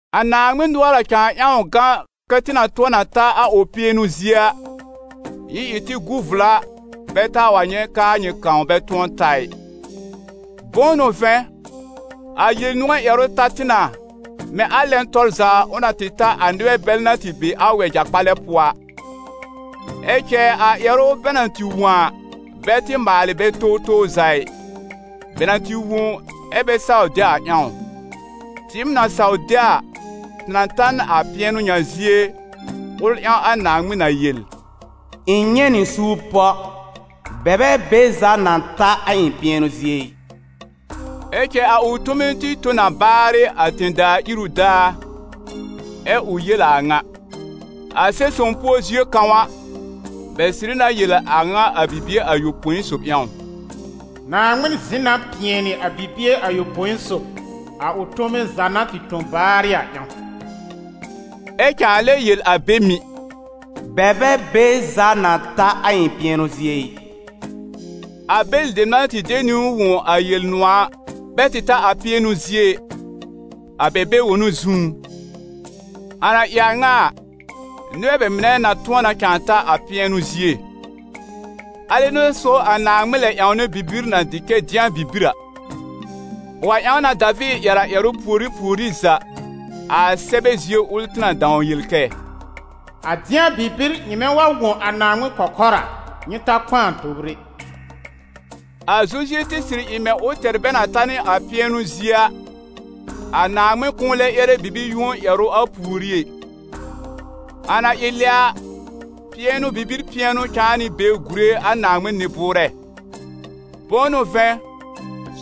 A Naaŋmɩn nʋɔr na cãa ƴãw gã, kɛ́ tɩ na tʋ̃ɔ na ta a ʋ pɩɛnʋ zie a, nyɩ ɩ tɩ gu vla bɛ taa wa nyɛ̃ k'aa nyɩ kãw bɛ tʋ̃ɔ ta ɩ. Bʋ̃ʋ n'ʋ vɛ̃, a Yel-nʋ̃ɔ̀ ƴɛrʋ ta tɩ na, mɛ̃ a lɛn tɔr za ʋ na tɩ ta a nɩbɛ bɛl na tɩ be a wɛja-kpalɛ pʋɔ a. Ɛ cɛ a ƴɛrʋ bɛ na tɩ wõ a, bɛ tɩ maalɩ bɛ towtow za ɩ, bɛ na tɩ wõ ɛ bɛ saw de a ƴãw. Tɩɩm na saw de a, tɩ na ta n a pɩɛnʋ ŋa zie, ʋl ƴãw a Naaŋmɩn na yel: «Ɩ̃ nyɛ̃ nɩ suur pɔ: bɛ bɛ be za na ta a ɩ̃ pɩɛnʋ zie ɩ!» Ɛ cɛ a ʋ tome tɩ tõ na baarɩ a tẽ-daa iru daar, ɛ ʋ yel a a ŋa. A Sɛb-sõw pʋɔ zie kãw a, bɛ sɩrɩ na yel a ŋa a bibie ayopõi sob ƴãw: «Naaŋmɩn zɩ̃ na pɩɛnɩ a bibie ayopõi sob, a ʋ tome za na tɩ tõ baarɩ a ƴãw.» Ɛ cãa lɛ yel a be mɩ̀: «Bɛ bɛ be za na ta a ɩ̃ pɩɛnʋ zie ɩ.» A bɛlɩ dem na tɩ de niwn wõ a Yel-nʋ̃ɔ̀ a, bɛ tɩ ta a pɩɛnʋ zie ɩ, a bɛ bɛ-wonu zũú. A na ɩ a ŋa a, nɩbɛ bɛ mɩnɛ na tʋ̃ɔ na cãa ta a pɩɛnʋ zie. A lɛ n'a so a Naaŋmɩn lɛb ƴãwnɛ bibir na dɩ kɛ «Dɩ̃a bibir» a. Ʋ wa ƴãw na Daviir ƴɛr a ƴɛrʋ pùorí pùorí za, a Sɛbɛ zie ʋl tɩ na dãw yel kɛ: «A dɩ̃a bibir nyɩmɛ wa wõ a Naaŋmɩn kɔkɔr a, nyɩ ta kpãa tobr ɛ.» A Zozue tɩ sɩrɩ ɩ mɛ̃ ʋ tɛr bɛ na ta n a pɩɛnʋ zie a, a Naaŋmɩn kʋ̃ʋ lɛ ƴɛrɛ bibi-yũo ƴɛrʋ a pùorí ɛ. A na ɩ lɛ a, pɩɛnʋ bibir pɩɛnʋ cãa nɩ be gùre a Naaŋmɩn nɩ-bʋʋrɛ. Bʋ̃ʋ n'ʋ vɛ̃,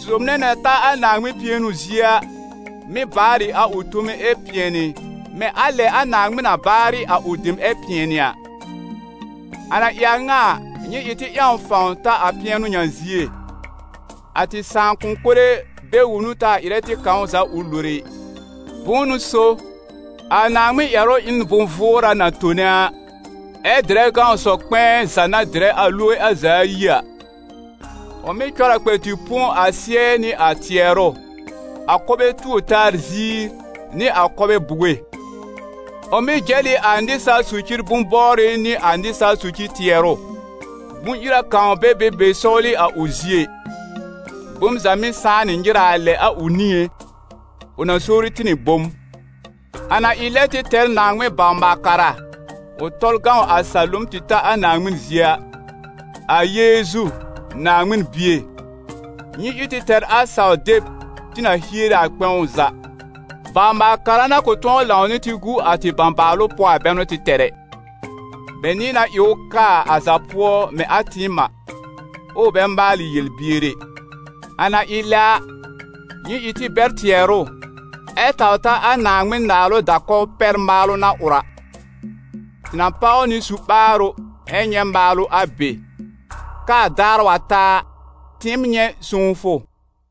sob nɛ na ta a Naaŋmɩn pɩɛnʋ zie a, mɩ́ baar ɩ a ʋ tome ɛ pɩɛnɩ, mɛ̃ a lɛ a Naaŋmɩn na baarɩ a ʋ dem ɛ pɩɛnɩ a. A na ɩ a ŋa a, nyɩ ɩ tɩ ƴãw fãw ta a pɩɛnʋ ŋa zie, a tɩ sãakʋm mɩnɛ bɛ-wonu taa ɩrɛ tɩ kãw za ʋ lore ɩ. Bʋ̃ʋ n'ʋ so, a Naaŋmɩn ƴɛrʋ ɩ n bʋ̃-vʋʋra na tone a, ɛ dɩrɛ gãw sɔ-kpɛ̃ɛ za na dɩrɛ a loge a za ayi a. Ʋ mɩ́ cɔr a kpɛ tɩ põ a sɩ́ɛ nɩ a tɩɛrʋ, a kɔbɛ tuor-taa ziir nɩ a kɔbɛ buge. Ʋ mɩ́ jɛl ɩ a nɩsaal socir bʋ̃-bɔbrɩ nɩ a nɩsaal socir tɩɛrʋ. Bʋ̃-ira kãw bɛ be be sɔwlɩ a ʋ zie ɩ. Bom za mɩ́ sãá nɩ nyɩraa lɛ a ʋ niŋé, ʋ na sowri tɩ nɩ bom. A na ɩ lɛ tɩ tɛr Naaŋmɩn bawr-maal-kara ʋ tɔl gãw a salom tɩ ta a Naaŋmɩn zie a, a Yeezu, Naaŋmɩn Bie, nyɩ ɩ tɩ tɛr a saw-deb tɩ na hiere a kpɛ̃w za. Bawr-maal-kara na kʋ̃ tʋ̃ɔ lãw nɩ tɩ gu a tɩ bãbaalʋ pʋɔ a bɛ n'ʋ tɩ tɛr ɛ; bɛ nɩ̃ɛ na ɩ ʋ kaa a za pʋɔ mɛ̃ a tɩɩm a, ɛ ʋ bɛ maalɩ yel-bier ɛ. A na ɩ lɛ a, nyɩ ɩ tɩ bɛr tɩɛrʋ ɛ taw ta a Naaŋmɩn naalʋ da-kɔw pɛr maalʋ na ʋr a. Tɩ na páw nɩ su-ɓaarʋ ɛ nyɛ̃ maalʋ a be, k'aa daar wa ta a, tɩɩm nyɛ̃ sõwfʋ.